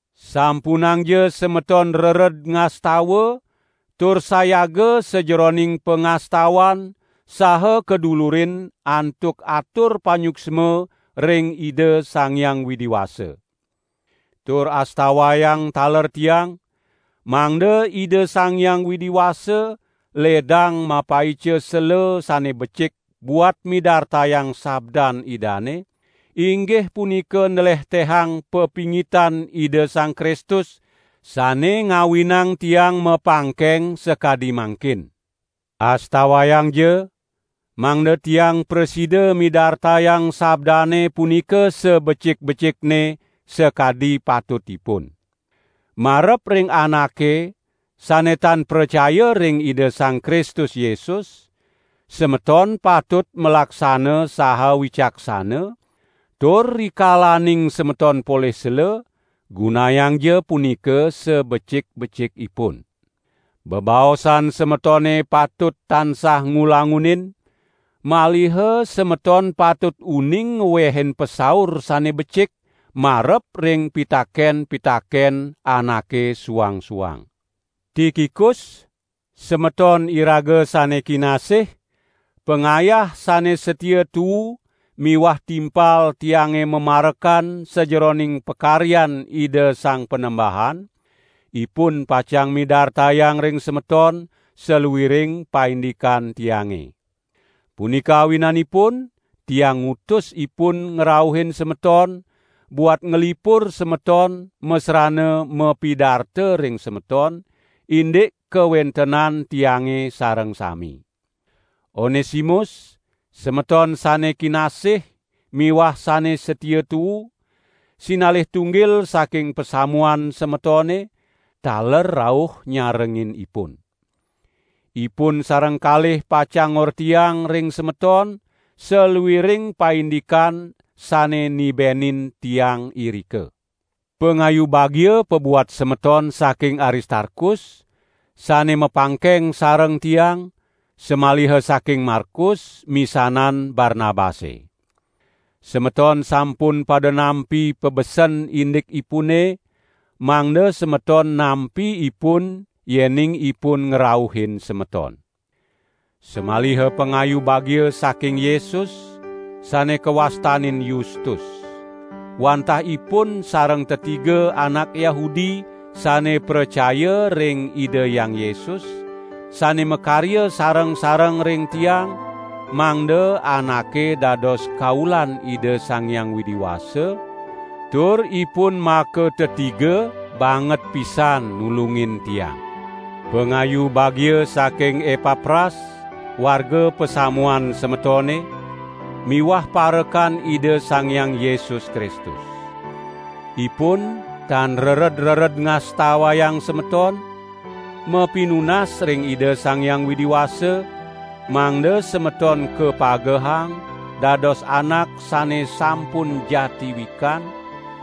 Sampunangja semeton rered ngastawa tur sayaga sajeroning pangastawan saha kadulurin antuk atur panyuksma ring Ida Sang Hyang Widi Wasa. Tur astawayang taler tiang, mangda Ida Sang Hyang Widi Wasa ledang mapaica sela sane becik buat midartayang sabdan Idane, inggih punika nlehtehang papingitan Ida Sang Kristus, sane ngawinang tiang mapangkeng sakadi mangkin. Astawayangja, mangda tiang prasida midartayang sabdane punika sabecik-becikne, sakadi patutipun. Marep ring anake sane tan pracaya ring Ida Sang Kristus Yesus, semeton patut malaksana saha wicaksana, tur rikalaning semeton polih sela, gunayangja punika sabecik-becikipun. Bebaosan semetone patut tansah ngulangunin, maliha semeton patut uning ngwehin pasaur sane becik marep ring pitaken-pitaken anake suang-suang. Tikikus, semeton iraga sane kinasih, pangayah sane satia tuu miwah timpal tiange mamarekan sajeroning pakaryan Ida Sang Panembahan, ipun pacang midartayang ring semeton saluiring paindikan tiange. Punika awinanipun tiang ngutus ipun ngrauhin semeton buat nglipur semeton masrana mapidarta ring semeton indik kawentenan tiange sareng sami. Onesimus, semeton sane kinasih miwah sane satia tuu, sinalih tunggil saking pasamuan semetone, taler rauh nyarengin ipun. Ipun sareng kalih pacang ngortiang ring semeton saluiring paindikan sane nibenin tiang irika. Pangayu bagia pabuat semeton saking Aristarkus, sane mapangkeng sareng tiang, samaliha saking Markus, misanan Barnabase. (Semeton sampun pada nampi pabesen indikipune, mangda semeton nampi ipun yening ipun ngrauhin semeton.) Samaliha pangayu bagia saking Yesus, sane kawastanin Yustus. Wantah ipun sareng tetiga anak Yahudi sane pracaya ring Ida Hyang Yesus, sane makarya sareng-sareng ring tiang mangda anake dados kaulan Ida Sang Hyang Widi Wasa, tur ipun makatetiga banget pisan nulungin tiang. Pangayu bagia saking Epapras, warga pasamuan semetone, miwah parekan Ida Sang Hyang Yesus Kristus. Ipun tan rered-rered ngastawayang semeton, mapinunas ring Ida Sang Hyang Widi Wasa, mangda semeton kapagehang, dados anak sane sampun jati wikan,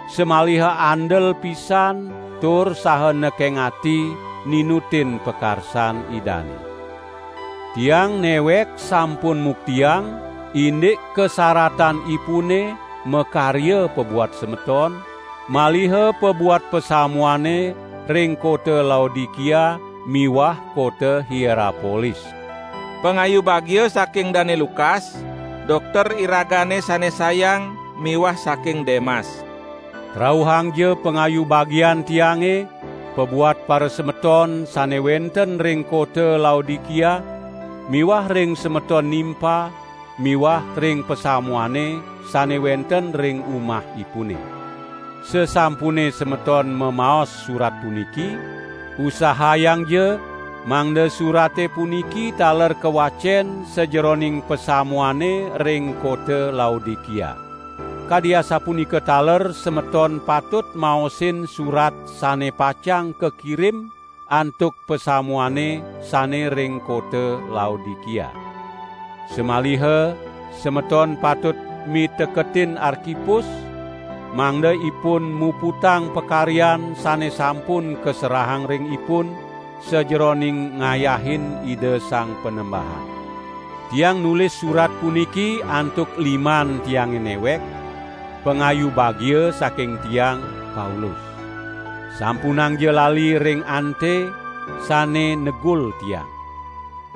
samaliha andel pisan tur saha nekeng ati ninutin pakarsan Idane. Tiang newek sampun muktiang indik kasaratan ipune makarya pabuat semeton, maliha pabuat pasamuane ring kota Laodikia miwah kota Hierapolis. Pangayu bagia saking Dane Lukas, dokter iragane sane sayang miwah saking Demas. Rauhangja pangayu bagian tiange pabuat parasemeton sane wenten ring kota Laodikia miwah ring semeton Nimpa miwah ring pasamuane sane wenten ring umahipune. Sasampune semeton memaos surat puniki, usahayangja mangda surate puniki taler kawacen sajeroning pasamuane ring kota Laodikia. Kadi asapunika taler semeton patut maosin surat sane pacang kakirim antuk pasamuane sane ring kota Laodikia. Samaliha semeton patut miteketin Arkipus, mangda ipun muputang pakaryan sane sampun kaserahang ring ipun sajeroning ngayahin Ida Sang Panembahan. Tiang nulis surat puniki antuk liman tiange newek: Pangayu bagia saking tiang, Paulus. Sampunangja lali ring ante, sane negul tiang.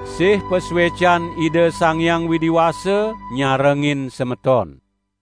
Sih pasuecan Ida Sang Hyang Widi Wasa nyarengin semeton!